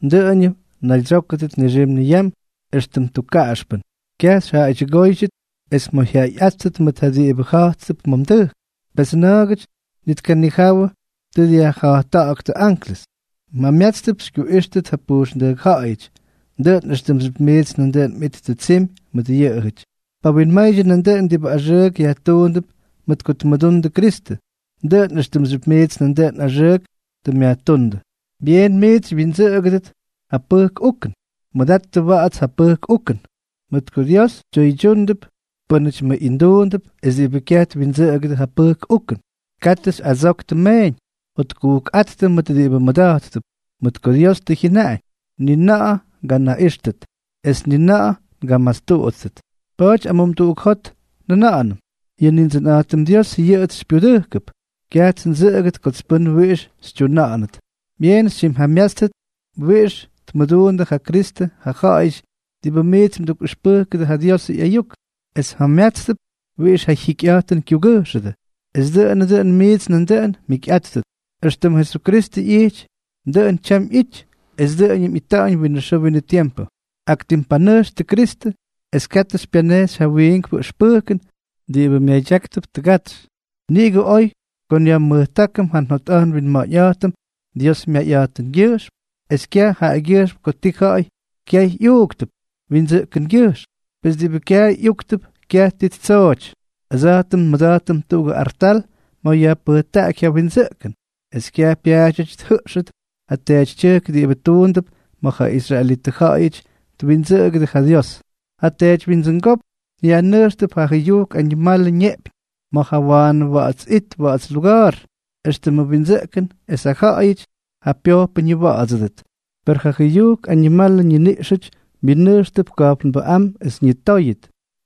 Dʉꞌʉñʉm mnaydsyókʉdʉt nixim niyam éxtʉm tukkaꞌaxpʉn. Kyaj xyjaꞌaydyʉgóydyʉt es mꞌoyjyaꞌayꞌáttʉt mʉt ja diꞌibʉ ja̱jttʉp ma̱ mdʉjk, pes na̱a̱gʉty ni tkanijawʉ tʉ dyajja̱jtta̱ꞌa̱ktʉ anklʉs. Mjamyátstʉp xykyuꞌíxtʉdʉ pujxndʉjk ja̱ꞌa̱yʉty, dʉꞌʉn éxtʉmxyʉp miits nandʉꞌʉn mꞌittʉ tsimy mʉt yʉꞌʉjʉty. Pawinmaydyʉ nandʉꞌʉn diꞌibʉ axʉʉk yajtuundʉp mʉt ko tmʉdundʉ Kristʉ, dʉꞌʉn éxtʉmxyʉp miits nandʉꞌʉn axʉʉk tʉ myajtúndʉ. Byeenʉm miits xywyindsʉꞌʉgʉdʉt ja pʉjk ukʉn. Mʉdattʉ wa̱ꞌa̱ts ja pʉjk ukʉn. Mʉt ko Dios tyʉydyúnʉdʉp pʉ́nʉty mʉꞌinduundʉp es diꞌibʉ kyaj twindsʉꞌʉgʉdʉ ja pʉjk ukʉn. Katʉ xyꞌadsoktʉ meeñ. Jotkujkꞌáttʉ mʉt diꞌibʉ mmʉda̱jttʉp, mʉt ko Dios tʉ jyʉnaꞌañ: “Ni na̱ꞌa̱ nganaꞌíxʉt, es ni na̱ꞌa̱ ngamastuꞌudʉt.” Pa̱a̱ty amumduꞌuk jot njʉna̱ꞌa̱nʉm: Yʉ Nindsʉnꞌa̱jtʉm Dios yʉꞌʉts xypyudʉjkʉp. Kyajts ndsʉꞌʉgʉt kots pʉ́n wiꞌix xytyuna̱ꞌa̱nʉt. Byeen xytyimjamyátstʉt wiꞌix tmʉduundʉ ja Kristʉ ja ja̱ꞌa̱yʉty diꞌibʉ miits mdukꞌʉxpʉjkʉdʉ ja Diosʉ ꞌyayuk, es mjamyátstʉp wiꞌix ja jyikyꞌa̱jtʉn kyugʉjxʉdʉ, es dʉꞌʉnʉ dʉn miits nandʉꞌʉn mjikyꞌáttʉt. Extʉm Jesukristʉ ꞌyijty, dʉꞌʉn tyam ꞌyity, es dʉꞌʉñʉm ꞌyita̱ꞌa̱ñ winʉ xʉʉ winʉ tiempʉ. Ak tim panʉjxtʉ Kristʉ, es katʉ xypyanejxy ja wiinkpʉ ʉxpʉjkʉn diꞌibʉ myadyáktʉp tʉgatsy. Niꞌigʉ oy ko nyajmʉktákʉm ja njotꞌa̱jt nwinma̱ꞌa̱ñꞌa̱jtʉm Dios myayꞌa̱jtʉngyʉjxm es kyaj jaꞌagyʉjxm ko tii ja̱ꞌa̱y kyaay ꞌyúktʉp windsʉꞌkʉngyʉjxm, pes diꞌibʉ kyaay ꞌyúktʉp kyaj ti ttsooty. Ʉdsa̱jtʉm nmʉda̱jtʉm tuꞌugʉ artal ma̱ yajpʉjtaꞌaky ja windsʉꞌkʉn, es kyaj pyaadyʉty tjʉꞌxʉt ja teetytyʉjk diꞌibʉ tuundʉp ma̱ ja israelitʉ ja̱ꞌa̱yʉty twindsʉꞌʉgʉdʉ ja Dios. Ja teedywyindsʉngópk yajnʉjxtʉp ja jʉyujk añimalʉ ñeꞌpyñ ma̱ ja Waanʉ Wa̱ꞌa̱ts It Wa̱ꞌa̱ts Luga̱a̱r, éxtʉmʉ windsʉꞌkʉn es ja ja̱ꞌa̱yʉty ja pyojpʉ ñiwa̱ꞌa̱dsʉdʉt, per ja jʉyujk añimalʉ ñiniꞌxʉty myʉnʉjxtʉp ka̱jpnbʉꞌám es ñitóyʉt.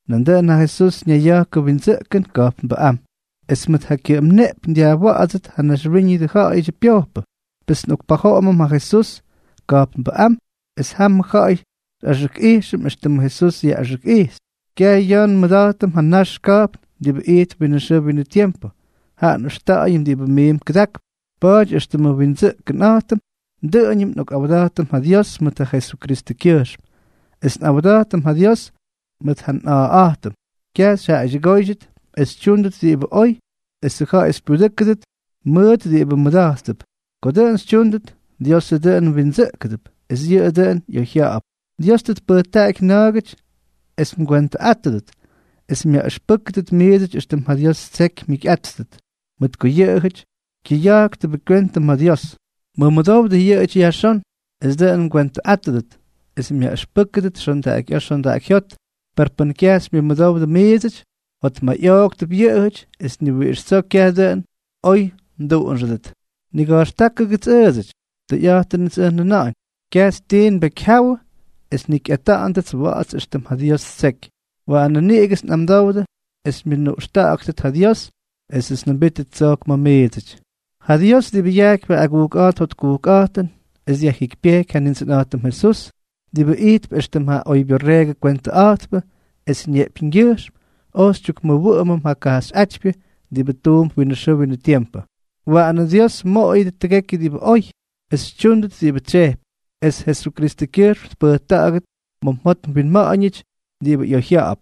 Nandʉꞌʉn ja Jesús ñayya̱jkʉ windsʉꞌkʉn ka̱jpnbʉꞌám, es mʉt ja kyʉꞌʉm neꞌpyñ dyajwa̱ꞌa̱dsʉt ja naxwíñʉdʉ ja̱ꞌa̱yʉdyʉ pyojpʉ. Pes nꞌokpajoꞌomʉm ja Jesús ka̱jpnbʉꞌám, es jamʉ ja̱ꞌa̱y xyꞌaxʉkꞌijxʉm éxtʉmʉ Jesús yaꞌꞌaxʉkꞌijxy. Kyaj ya̱ nmʉda̱jtʉm ja nax ka̱jpn diꞌibʉ ijtp winʉ xʉʉ winʉ tiempʉ, jaꞌa nꞌʉxta̱ꞌa̱yʉm diꞌibʉ miin kʉdakp. Pa̱a̱ty éxtʉmʉ nwindsʉꞌkʉnꞌa̱jtʉm, dʉꞌʉñʉm nꞌokꞌawda̱jtʉm ja Dios mʉt ja Jesukristʉkyʉjxm, es nꞌawda̱jtʉm ja Dios mʉt ja nꞌa̱a̱ꞌa̱jtʉm. Kyaj xyjaꞌaydyʉgóydyʉt es xytyúndʉt diꞌibʉ oy esʉ ja̱ꞌa̱y xypyudʉ́kʉdʉt mʉʉt diꞌibʉ mmʉda̱jttʉp. Ko dʉꞌʉn xytyúndʉt, Diosʉ dʉꞌʉn mwindsʉꞌkʉdʉp, es yʉꞌʉ dʉꞌʉn ꞌyoyjya̱ꞌa̱p. Dios tʉ tpʉjtaꞌaky na̱a̱gʉty es mgwentʉꞌátʉdʉt es myaꞌʉxpʉ́kʉdʉt miidsʉty éxtʉm ja Dios ttseky mjikyꞌáttʉt, mʉt ko yʉꞌʉjʉty kyʉyáktʉbʉ kywentʉ ma̱ Dios. Mʉmʉdowdʉ yʉꞌʉjʉty yajxón, es dʉꞌʉn mgwentʉꞌátʉdʉt es myaꞌʉxpʉ́kʉdʉt xondaꞌakyꞌa̱a̱ xondaꞌakyjyót; per pʉn kyaj xymyʉmʉdowdʉ miidsʉty, jotmayꞌooktʉp yʉꞌʉjʉty es ni wiꞌix tsoo kyaj dʉꞌʉn oy mduꞌunxʉdʉt. Niga̱jxtákʉdʉts ʉʉdsʉty. Tʉyꞌa̱jtʉnʉts ʉj njʉna̱ꞌa̱ñ, kyajts tii nbekyjyáwʉdʉ es njikyꞌata̱ꞌa̱ndʉts wa̱ꞌa̱ts éxtʉm ja Dios ttseky. Waanʉ niꞌigʉts nꞌamdowdʉ es xymyʉnuꞌxta̱ꞌa̱ktʉt ja Dios esʉts njʉmbítʉt tsojk ma̱ miidsʉty. Ja Dios, diꞌibʉ yajkypy ja agujkꞌa̱jt jotkujkꞌa̱jtʉn es dyajjikypyejky ja Nindsʉnꞌa̱jtʉm Jesús, diꞌibʉ ijtp éxtʉm ja oybyorreegʉ kwentʉꞌa̱jtpʉ es ñeꞌpyñgyʉjxm oj xytyukmʉwʉꞌʉmʉm ja kajxyꞌátypyʉ diꞌibʉ tuump winʉ xʉʉ winʉ tiempʉ, waꞌanʉ Dios mmoꞌoyʉdʉ tʉgekyʉ diꞌibʉ oy, es xytyúndʉt diꞌibʉ tsyejpy, es Jesukristʉkyʉjxm tpʉjta̱ꞌa̱gʉt ma̱ mjot mwinma̱ꞌa̱ñʉty diꞌibʉ ꞌyoyjya̱ꞌa̱p.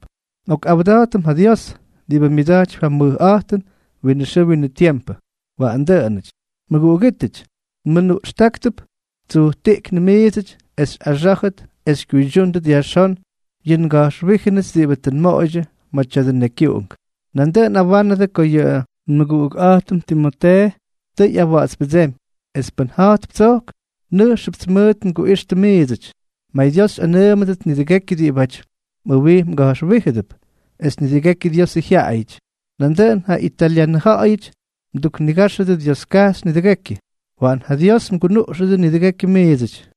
Nꞌokꞌawda̱jtʉm ja Dios, diꞌibʉ myʉda̱jtypy ja mʉjꞌa̱jtʉn winʉ xʉʉ winʉ tiempʉ. Waꞌan dʉꞌʉnʉty. Mʉguꞌugítʉty, nmʉnuꞌxtáktʉp tsujtiꞌknʉ miidsʉty es xyꞌaxá̱jʉt es xykyuydyúndʉt yajxón yʉ nga̱jxwíjʉnʉts diꞌibʉ tʉ nmoꞌoydyʉ ma̱ tya̱dʉ nekyuꞌunk. Nandʉꞌʉn nꞌawánʉdʉ ko yʉ nmʉguꞌukꞌa̱jtʉm Timotee tʉ ꞌyawa̱ꞌa̱tspʉdsémy, es pʉn ja̱jtp tsojk, nʉjxʉpts mʉʉt nguꞌixtʉ miidsʉty. MayDios xyꞌanʉʉmʉdʉt nidʉgekyʉ diꞌibáty mꞌʉwij mga̱jxwíjʉdʉp, es nidʉgekyʉ Diosʉ jyaꞌayʉty. Nandʉꞌʉn ja italyanʉ ja̱ꞌa̱yʉty mduknigáxʉdʉ Dioskajxy nidʉgekyʉ. Waꞌan ja Dios mgunuꞌxʉdʉ nidʉgekyʉ miidsʉty.